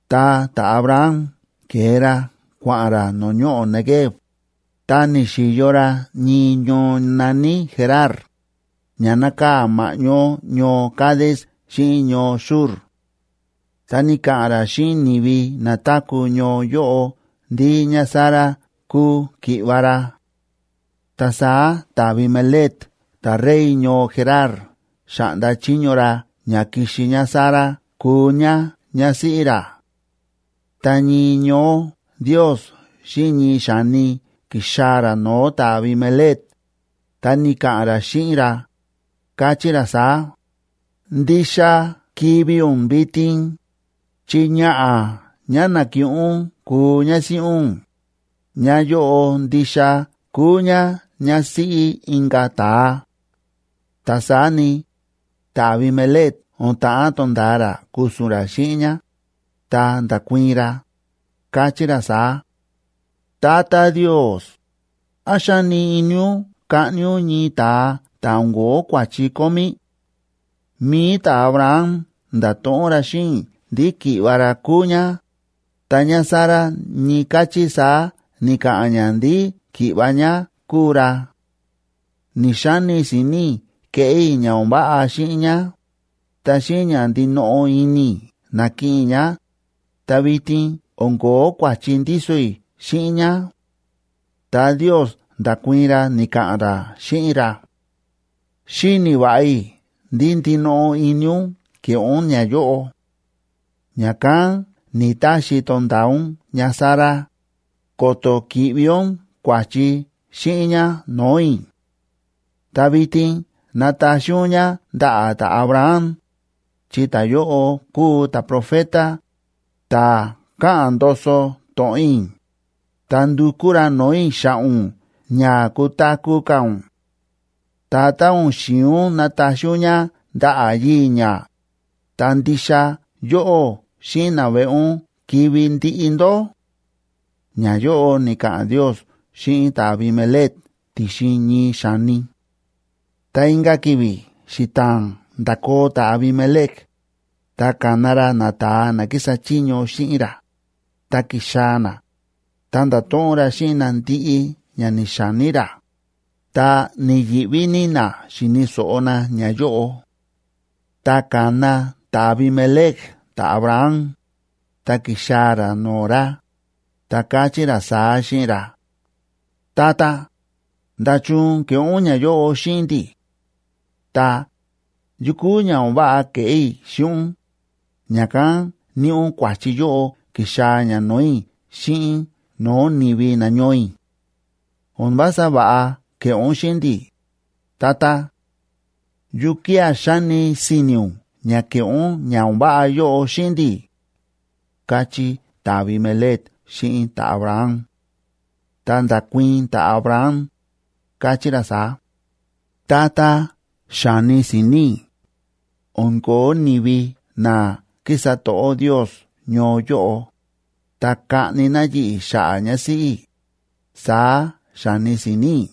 Ta ta̱Abraham ke̱e ra kua̱ꞌa̱n ra no̱o̱ ñoꞌo̱ Neguev, ta ni̱xi̱yo ra ñii ñoo na̱ní Gerar, ña nákaa̱ ma̱ꞌñó ñoo Cades xíꞌin ñoo Shur. Ta ni̱ka̱ꞌa̱n ra xíꞌin ni̱vi na táku̱ ñoo yóꞌo ndí ñáSara kúu ki̱ꞌva̱ ra. Ta saá ta̱Abimelec ta̱rey ñoo Gerar xa̱ꞌnda chiño ra ña kixi ñáSara kuu ñá ñásíꞌí ra. Ta ñii ñoó Ndios xíꞌin ñii xa̱ni ki̱xaa̱ ra no̱o̱ ta̱Abimelec, ta ni̱ka̱ꞌa̱n ra xíꞌin ra, káchí ra saá: “Ndixa kivi̱ ún vitin, chi ñaꞌa̱ ñá na̱kiꞌin ún kuu ñásíꞌí ún, ñáyóꞌo ndixa kúu ñá ñásíꞌí inka̱ ta̱a.” Ta saá ni, ta̱Abimelec o̱n ta̱ꞌán to̱nda̱a ra ku̱su̱n ra xíꞌin ñá, ta nda̱kuii̱n ra, káchí ra saá: “Tata Ndios, ¿án xáni ini ún kaꞌni ún ñii ta̱a ta̱ o̱n ko̱ó kua̱chi kómí? Mi̱i ta̱Abraham nda̱to̱ꞌon ra xíꞌin i̱ ndí ki̱ꞌva̱ ra kúu ñá, ta ñáSara ñii káchí saá ni̱ka̱ꞌa̱n ñá ndí ki̱ꞌva̱ ñá kúu ra. Ni̱‑xani si̱ni̱ i̱ keꞌé i̱ ña o̱n váꞌa xíꞌin ñá, ta xíꞌin ña ndinoꞌo ini i̱ na̱kiꞌin i̱ ñá, ta vitin o̱n ko̱ó kua̱chi ndíso i̱ xíꞌin ñá.” Ta Ndios nda̱kuii̱n ra, ni̱ka̱ꞌa̱n ra xíꞌin ra: “Xíni̱ va̱ꞌa i̱ ndí ndinoꞌo ini ún ke̱ꞌé ún ñayóꞌo. Ña̱kán ni̱‑taxi i̱ to̱nda̱a ún ñáSara, ko̱to̱ ki̱ꞌvi ún kua̱chi xíꞌin ñá no̱o̱ i̱. Ta vitin nataxi ún ñá ndaꞌa̱ ta̱Abraham, chi ta̱yóꞌo kúu ta̱profeta, ta̱ káꞌa̱n ndoso to̱ꞌon i̱, ta ndukú ra no̱o̱ i̱ xa̱ꞌa̱ ún ña kutaku̱ ka̱ ún. Ta tá o̱n xi̱in ún nataxi ún ñá ndaꞌa̱ yii̱ ñá, ta ndixa yóꞌó xíꞌin naveꞌe ún kivi̱ ndiꞌi ndó.” Ñayóꞌo ni̱ka̱ꞌa̱n Ndios xíꞌin ta̱Abimelec ti̱xin ñii xa̱ni. Ta inka̱ ki̱vi̱ xita̱a̱n nda̱koo ta̱Abimelec, ta ka̱na ra nata̱a na kísa chiño xíꞌin ra, ta ki̱xaa̱ na, ta nda̱to̱ꞌon ra xíꞌin na ndiꞌi ña ni̱xa̱ní ra. Ta ni̱yi̱ꞌví ní na xi̱ni̱ so̱ꞌo na ñayóꞌo. Ta ka̱na ta̱Abimelec ta̱Abraham, ta ki̱xaa̱ ra no̱o̱ ra, ta káchí ra saá xíꞌin ra: ―Tata, ¿nda̱chun ke̱ꞌé ún ñayóꞌo xíꞌin ndi̱? Ta, ¿yukú ña o̱n váꞌa ke̱ꞌé i̱ xíꞌin ún, ña̱kán níꞌi ún kua̱chi yóꞌo ki̱xaa̱ ña no̱o̱ i̱ xíꞌin no̱o̱ ni̱vi nañoo i̱? O̱n vása va̱ꞌa ke̱ꞌé ún xíꞌin ndi̱, tata. ¿Yukía̱ xa̱ni si̱ni̱ ún ña ke̱ꞌé ún ña o̱n váꞌa yóꞌo xíꞌin ndi̱? ―káchí ta̱Abimelec xíꞌin ta̱Abraham. Ta nda̱kuii̱n ta̱Abraham, káchí ra saá: ―Tata, xa̱ni si̱ni̱ i̱: “O̱n ko̱ó ni̱vi na kísa to̱ꞌó Ndios ñoo yóꞌo, ta kaꞌni na yi̱ꞌi̱ xa̱ꞌa̱ ñásíꞌí i̱”, saá xa̱ni si̱ni̱ i̱.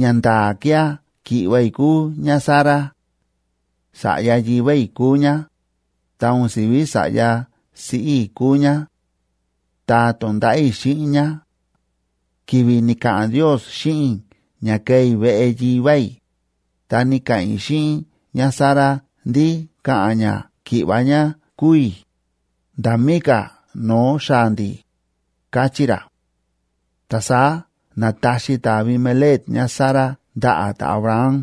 Ñanda̱a̱ kía̱ ki̱ꞌva̱ i̱ kúu ñáSara; sa̱ꞌya yivá i̱ kúu ñá, ta o̱n si̱ví sa̱ꞌya siꞌí i̱ kúu ñá; ta to̱nda̱ꞌa̱ i̱ xíꞌin ñá. Ki̱vi̱ ni̱ka̱ꞌa̱n Ndios xíꞌin i̱ ña ke̱e i̱ veꞌe yivá i̱, ta ni̱ka̱ꞌa̱n i̱ xíꞌin ñáSara ndí ka̱ꞌa̱n ñá ki̱ꞌva̱ ñá kúu i̱, nda̱ mí ka̱ no̱o̱ xaa̱ ndi̱ ―káchí ra. Ta saá na̱taxi ta̱Abimelec ñáSara ndaꞌa̱ ta̱Abraham.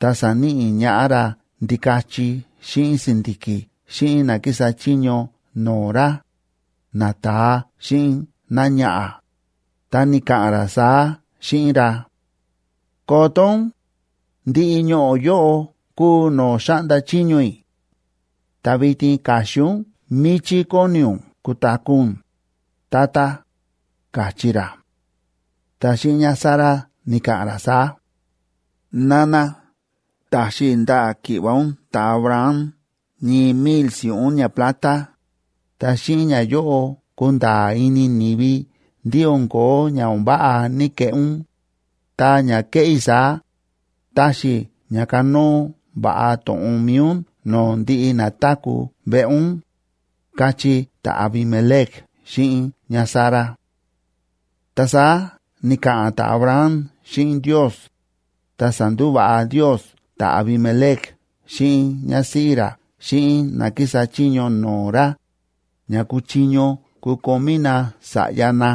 Ta sa̱níꞌi ñaꞌá ra ndikachi xíꞌin si̱ndi̱ki̱ xíꞌin na kísa chiño no̱o̱ ra, nata̱a xíꞌin náñaꞌa̱, ta ni̱ka̱ꞌa̱n ra saá xíꞌin ra: ―Koto ún, ndiꞌi ñoꞌo̱ yóꞌo kúu no̱o̱ xáꞌnda chiño i̱; ta vitin ka̱xin ún míchí kóni ún kutaku̱ ún, tata ―káchí ra. Ta xíꞌin ñáSara ni̱ka̱ꞌa̱n ra saá: ―Nana, ta̱xi i̱ ndaꞌa̱ ki̱ꞌva̱ ún ta̱Abraham ñii mil si̱ꞌún ñaplata, ta xíꞌin ñayóꞌo kunda̱a̱ ini ni̱vi ndí o̱n ko̱ó ña o̱n váꞌa ní‑keꞌé ún, ta ña kéꞌé i̱ saá, taxi ña kanóo va̱ꞌa to̱ꞌon mi̱i ún no̱o̱ ndiꞌi na táku̱ veꞌe ún ―káchí ta̱Abimelec xíꞌin ñáSara. Ta saá ni̱ka̱ꞌa̱n ta̱Abraham xíꞌin Ndios, ta sa̱ndúva̱ꞌa Ndios ta̱Abimelec xíꞌin ñásíꞌí ra xíꞌin ná kísa chiño no̱o̱ ra, ña kuchiño kukomí na sa̱ꞌya na,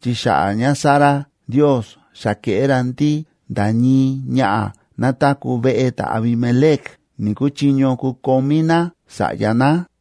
chi xa̱ꞌa̱ ñáSara Ndiosa xa ke̱ꞌé ra ndí nda̱ ñii ñaꞌa̱ ná táku̱ veꞌe ta̱Abimelec ni̱‑kuchiño kukomí ná sa̱ꞌya ná.